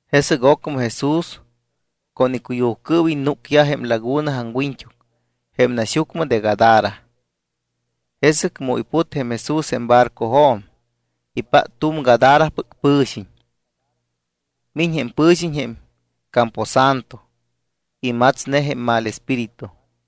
Jesɨc ocmɨ Jesús con icuyujcɨɨwiñ núcyaj jém laguna aŋwiñt́uc jém naxyucmɨ de Gadara. Jesɨc mu iput jém Jesús jém barcojo̱m, ipát tu̱m Gadarapɨc pɨ̱xiñ. Miñ jém pɨ̱xiñ jém camposanto. Imatsne jém mal espíritu.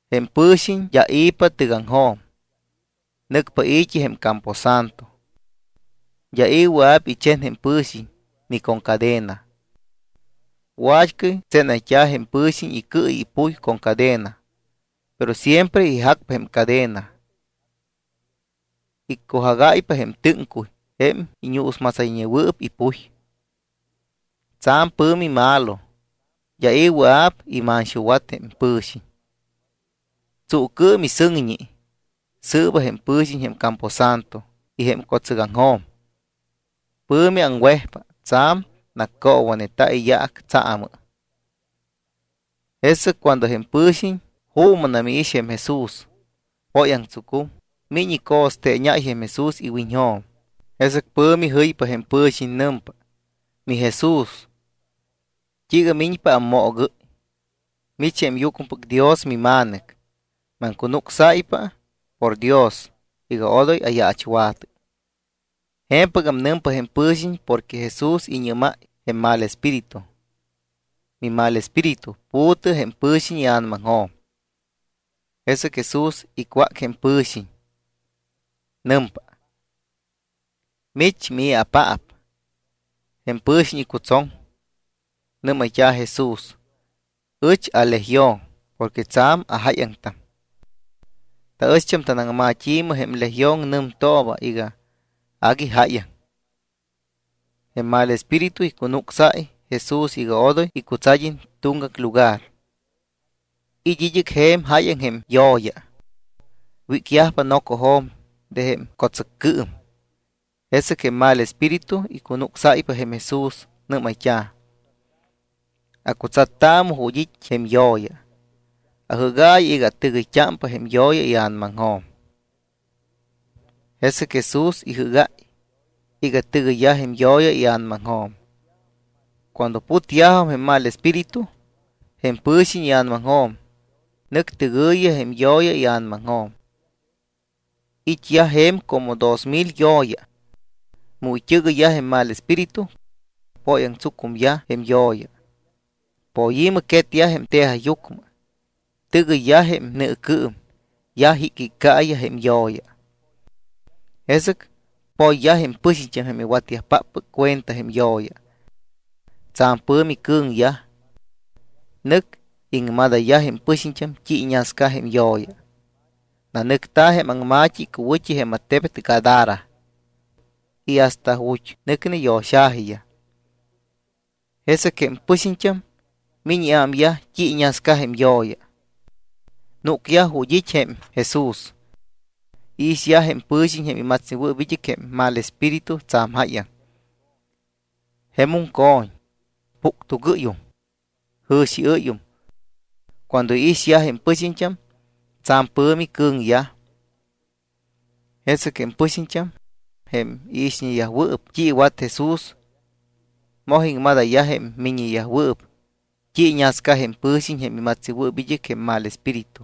Jém pɨ̱xiñ d́a i̱pa tɨgaŋjo̱m, nɨcpa i̱t́i jém camposanto. D́a i̱ wɨa̱p ichen jém pɨ̱xiñ ni con cadena. Wa̱t́cɨy tsénayt́a̱ jém pɨ̱xiñ icɨ y ipuy con cadena, pero siempre ijacpa jém cadena. Iccujagáypa jém tɨ́ŋcuy jém iñuusmatsayñewɨɨp ipuy. Tsa̱m pɨ̱mi malo, d́a i̱ wɨa̱p imanxuwat jém pɨ̱xiñ. Tsuucɨɨm y sɨŋñi sɨɨba jém pɨ̱xiñ jém camposanto y jém co̱tsɨcjo̱m. Pɨ̱mi aŋwejpa. Tsa̱m naccoowaneta̱ iyaac tsaamɨ. Jesɨc cuando jém pɨ̱xiñ juumɨnam iix jém Jesús, póyaŋtsucum, miñ ico̱steeñáy jém Jesús iwiñjo̱m. Jesɨc pɨ̱mi jɨypa jém pɨ̱xiñ. Nɨmpa: —MiJesús, ¿t́iiga miñpa ammoogɨ́y? Mich jém Yucmɨpɨc Dios miMa̱nɨc. Maŋcunucsáypa por Dios iga odoy ayaachwa̱tɨ. Je̱mpɨgam nɨmpa jém pɨ̱xiñ porque Jesús iñɨ́máy jém mal espíritu: —Mimalespíritu, pu̱tɨ jém pɨ̱xiñ ia̱namaŋjo̱m. Jesɨc Jesús icwác jém pɨ̱xiñ, nɨmpa: —¿Mich, mii̱apaap? Jém pɨ̱xiñ icutsoŋ. Nɨ́mayt́a̱ Jesús: —Ɨch aLegión porque tsa̱m ajáyaŋtam. Taɨch tanaŋma̱t́i jém legión nɨmtooba iga agui jáyaŋ. Jém mal espíritu icunucsáy Jesús iga odoy icutsad́iñ tuŋgac lugar. It́ id́ɨc je̱m jáyaŋ jém yo̱ya. Wícyajpa nocojo̱m de jém co̱tsɨccɨɨm. Jesɨc jém mal espíritu icunucsáypa jém Jesús. Nɨ́mayt́a̱: —Acutsattaamɨ ju̱t́ it́ jém yo̱ya. Ajɨ́gaayɨ iga atɨgɨyt́ámpa jém yo̱ya ia̱namaŋjo̱m. Jesɨc Jesús ijɨ́gáy iga tɨgɨyyaj jém yo̱ya ia̱namaŋjo̱m. Cuando putyajum jém mal espíritu jém pɨ̱xiñ ia̱namaŋjo̱m, nɨc tɨgɨ̱yiyaj jém yo̱ya ia̱namaŋjo̱m. It́yaj je̱m como dos mil yo̱ya. Mu it́ɨgɨyyaj jém mal espíritu, póyaŋtsucumyaj jém yo̱ya. Poyi̱mɨ quetyaj jém tejajyucmɨ. Tɨgɨyyaj jém nɨɨcɨɨm. Yaj jicjiccaiyaj jém yo̱ya. Jesɨc poyyaj jém pɨxiñt́am jém iwatyajpáppɨc cuenta jém yo̱ya. Tsa̱m pɨ̱mi cɨ̱ŋyaj. Nɨc iŋmadayyaj jém pɨxiñt́am t́i iñascayaj jém yo̱ya. Nanɨcta̱ jém aŋma̱t́i icuwɨ̱t́i jém attebet Gadara y hasta ju̱t́ nɨcne yo̱xa̱jiyaj. Jesɨc jém pɨxiñt́am miñ iámyaj t́i iñascayaj jém yo̱ya. Núcyaj ju̱t́ it́ jém Jesús. Iixyaj jém pɨ̱xiñ jém imatsnewɨɨp id́ɨc jém mal espíritu tsa̱m jáyaŋ. Jemum co̱ñ, puctugɨ́yum, jɨ̱xiɨ́yum. Cuando iixyaj jém pɨxiñt́am, tsa̱m pɨ̱mi cɨ̱ŋyaj. Jesɨc jém pɨxiñt́am, jém iixñeyajwɨɨp t́i iwat Jesús, moj iŋmadayyaj jém miññeyajwɨɨp t́i iñasca jém pɨ̱xiñ jém imatsnewɨɨp id́ɨc jém mal espíritu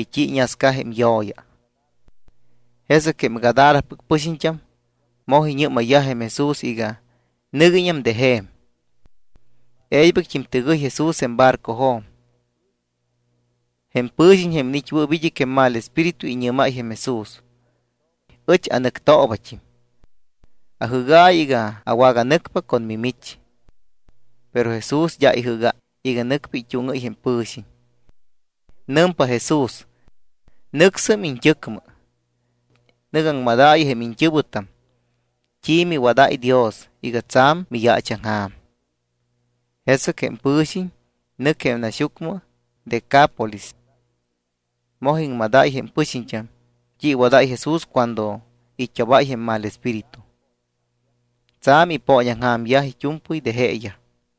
y t́i iñasca jém yo̱ya. Jesɨc jém Gadarapɨc pɨxiñt́am moj iñɨ́mayyaj jém Jesús iga nɨguiñam de je̱m. E̱ybɨct́im tɨgɨy Jesús jém barcojo̱m. Jém pɨ̱xiñ, jém iniit́wɨɨp id́ɨc jém mal espíritu, iñɨ́máy jém Jesús: —Ɨch anɨctoobat́im. Ajɨ́gaayɨ iga awaganɨcpa con mimich. Pero Jesús d́a ijɨ́gáy iga nɨcpa it́úŋɨ́y jém pɨ̱xiñ. Nɨmpa Jesús: —Nɨcsɨm iñt́ɨcmɨ. Nɨ̱gɨ aŋmadaayɨ jém iñt́ɨ̱wɨtam t́i miwadáy Dios iga tsa̱m miyaachaŋja̱m. Jesɨc jém pɨ̱xiñ nɨc jém naxyucmɨ Decápolis. Moj iŋmadáy jém pɨxiñt́am t́i iwadáy Jesús cuando it́obáy jém mal espíritu. Tsa̱m ipooñaŋja̱myaj it́u̱mpɨy de jeeyaj.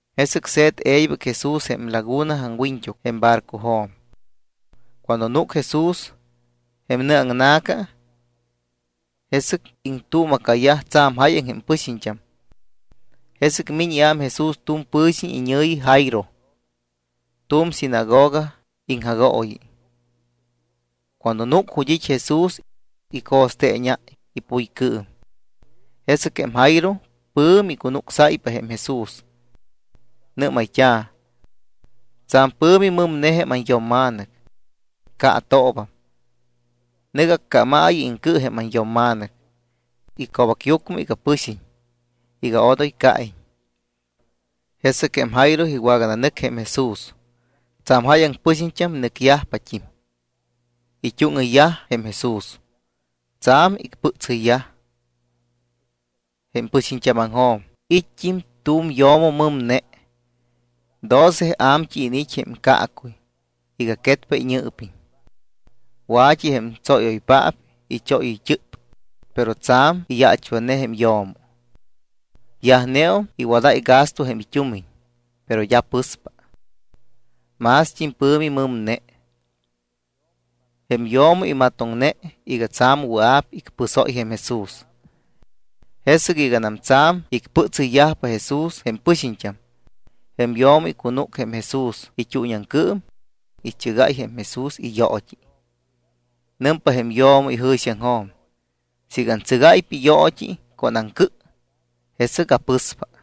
Jesɨc se̱t e̱ybɨc Jesús jém laguna aŋwiñt́uc jém barcojo̱m. Cuando núc Jesús jém nɨ aŋna̱ca, jesɨc iŋtuuma̱cayaj tsa̱m jáyaŋ jém pɨxiñt́am. Jesɨc miñ iám Jesús tu̱m pɨ̱xiñ iñɨ̱yi Jairo, tu̱m sinagoga iŋjagooyi. Cuando núc ju̱t́ it́ Jesús, ico̱steeñáy ipuycɨɨm. Jesɨc jém Jairo pɨ̱mi icunucsáypa jém Jesús. Nɨ́mayt́a̱: —Tsa̱m pɨ̱mi mɨmne jém anyo̱mma̱nɨc. Caatoobam. Nɨ̱gɨ accámaayɨ iŋcɨ jém anyo̱mma̱nɨc ico̱bacyucmɨ iga pɨxiñ iga odoy caiñ. Jesɨc jém Jairo iwagananɨc jém Jesús. Tsa̱m jáyaŋ pɨxiñt́am nɨcyajt́im, it́úŋɨyyaj jém Jesús. Tsa̱m icpɨtsɨyyaj. Jém pɨxiñt́ámaŋjo̱m it́t́im tu̱m yo̱mo mɨmne. Doce a̱mt́ɨy iniit́ jém caacuy iga quetpa iñɨɨpiñ. Wa̱t́i jém tsóyɨ́yoypaap ichóyɨyt́ɨp, pero tsa̱m iyaachwatne jém yo̱mo. Yajneum iwadáy gasto jém it́umiñ, pero d́a pɨspa. Mást́im pɨ̱mi mɨmne. Jém yo̱mo imatoŋne iga tsa̱m wɨa̱p icpɨsóy jém Jesús. Jesɨc iganam tsa̱m icpɨtsɨyyajpa Jesús jém pɨxiñt́am, jém yo̱mo icunúc jém Jesús it́uuñiaŋcɨɨm, ichɨgáy jém Jesús iyoot́i. Nɨmpa jém yo̱mo ijɨ̱xiaŋjo̱m: “Siiga antsɨgáypa iyoot́i con aŋcɨ, jesɨc apɨspa.”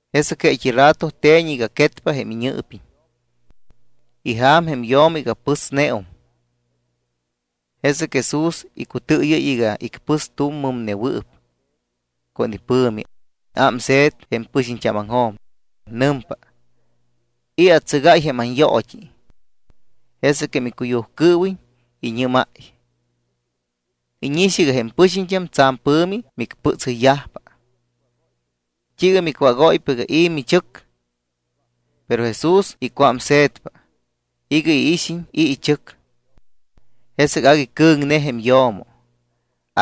Jesɨc jeet́i rato te̱ñ iga quetpa jém iñɨɨpiñ. Ija̱m jém yo̱mo iga pɨsneum. Jesɨc Jesús icutɨɨyɨ́y iga icpɨs tu̱m mɨmnewɨɨp con ipɨ̱mi, ámse̱t jém pɨxiñt́ámaŋjo̱m, nɨmpa: —¿I̱ atsɨgáy jém anyoot́i? Jesɨc jém icuyujcɨɨwiñ iñɨ́máy: —Íñix iga jém pɨxiñt́am tsa̱m pɨ̱mi micpɨtsɨyyajpa. ¿T́iiga micwágóypa iga i̱ michɨc? Pero Jesús icuámse̱tpa iga iixiñ i̱ ichɨc. Jesɨc agui cɨ̱ŋne jém yo̱mo,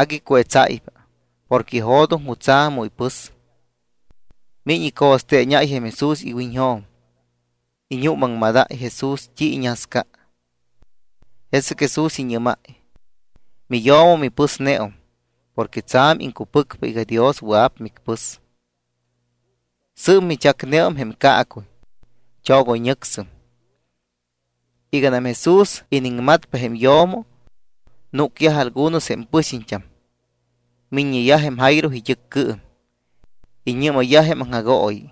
agui cuetsáypa porque ijo̱doŋ jutsa̱ mu ipɨs. Miñ ico̱steeñáy jém Jesús iwiñjo̱m, iñuumaŋmadáy Jesús t́i iñasca. Jesɨc Jesús iñɨ́máy: —Miyo̱mo, mipɨsneum porque tsa̱m iŋcupɨcpa iga Dios wɨa̱p micpɨs. Sɨɨp michacneum jém caacuy. Chogoyñɨcsɨm. Iganam Jesús iniŋmatpa jém yo̱mo, núcyaj algunos jém pɨxiñt́am, miññeyaj jém Jairo it́ɨccɨɨm. Iñɨ́mayyaj jém aŋjagooyi: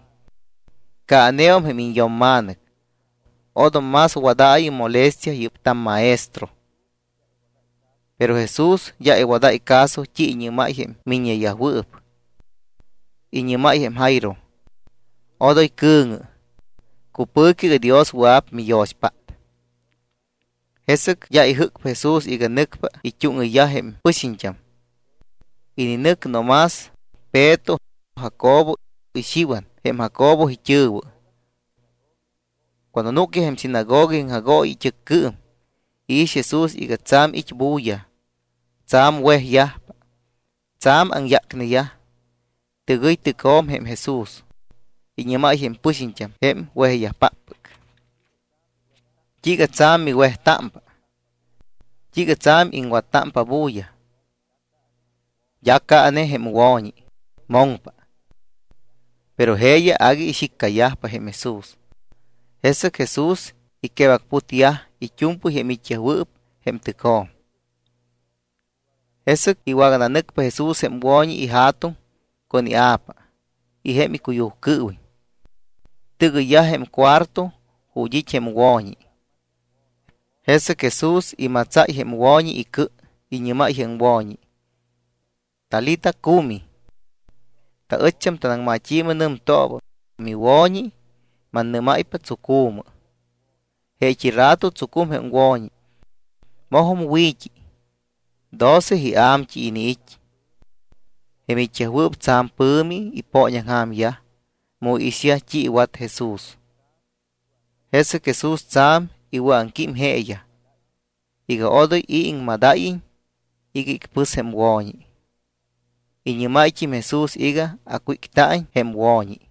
—Caaneum jém iñyo̱mma̱nɨc. Odom más wadaayɨ molestia yɨ́p tammaestro. Pero Jesús d́a iwadáy caso t́i iñɨ́máy jém miññeyajwɨɨp. Iñɨ́máy jém Jairo: —Odoy cɨ̱ŋɨ. Cupɨ̱cɨ iga Dios wɨa̱p miyo̱xpát. Jesɨc d́a ijɨ́cpa Jesús iga nɨcpa it́úŋɨyyaj jém pɨxiñt́am. Ininɨc no más Peto, Jacobo, y Xiwan jém Jacobo it́ɨ̱wɨ. Cuando núcyaj jém sinagoga iŋjagooyi it́ɨccɨɨm, iix Jesús iga tsa̱m it́ bulla, tsa̱m wejyajpa, tsa̱m aŋyácneyaj. Tɨgɨy tɨcjo̱m jém Jesús, iñɨ́máy jém pɨxiñt́am jém wejyajpáppɨc: —¿T́iiga tsa̱m miwejtámpa? ¿T́iiga tsa̱m iŋwattámpa bulla? D́a caane jém wo̱ñi, moŋpa. Pero jeeyaj agui ixíccayajpa jém Jesús. Jesɨc Jesús iquebacputyaj it́u̱mpɨy jém it́yajwɨɨp jém tɨcjo̱m. Jesɨc iwagananɨcpa Jesús jém wo̱ñi ija̱tuŋ con ia̱pa y jém icuyujcɨɨwiñ. Tɨgɨyyaj jém cuarto ju̱t́ it́ jém wo̱ñi. Jesɨc Jesús imatsáy jém wo̱ñi icɨ, iñɨ́máy jém wo̱ñi: —Talita cumi. Taɨcht́am tanaŋmat́i̱mɨ nɨmtooba: Miwo̱ñi, mannɨ́máypa, tsucu̱mɨ. Jeet́i rato tsucum jém wo̱ñi. Mojum wi̱t́i. Doce ia̱mt́ɨy iniit́. Jém it́yajwɨɨp tsa̱m pɨ̱mi ipooñaŋja̱myaj mu iixyaj t́i iwat Jesús. Jesɨc Jesús tsa̱m iwɨ̱aŋquím jeeyaj iga odoy i̱ iŋmadáyiñ iga icpɨs jém wo̱ñi. Iñɨ́máyt́im Jesús iga acwícta̱iñ jém wo̱ñi.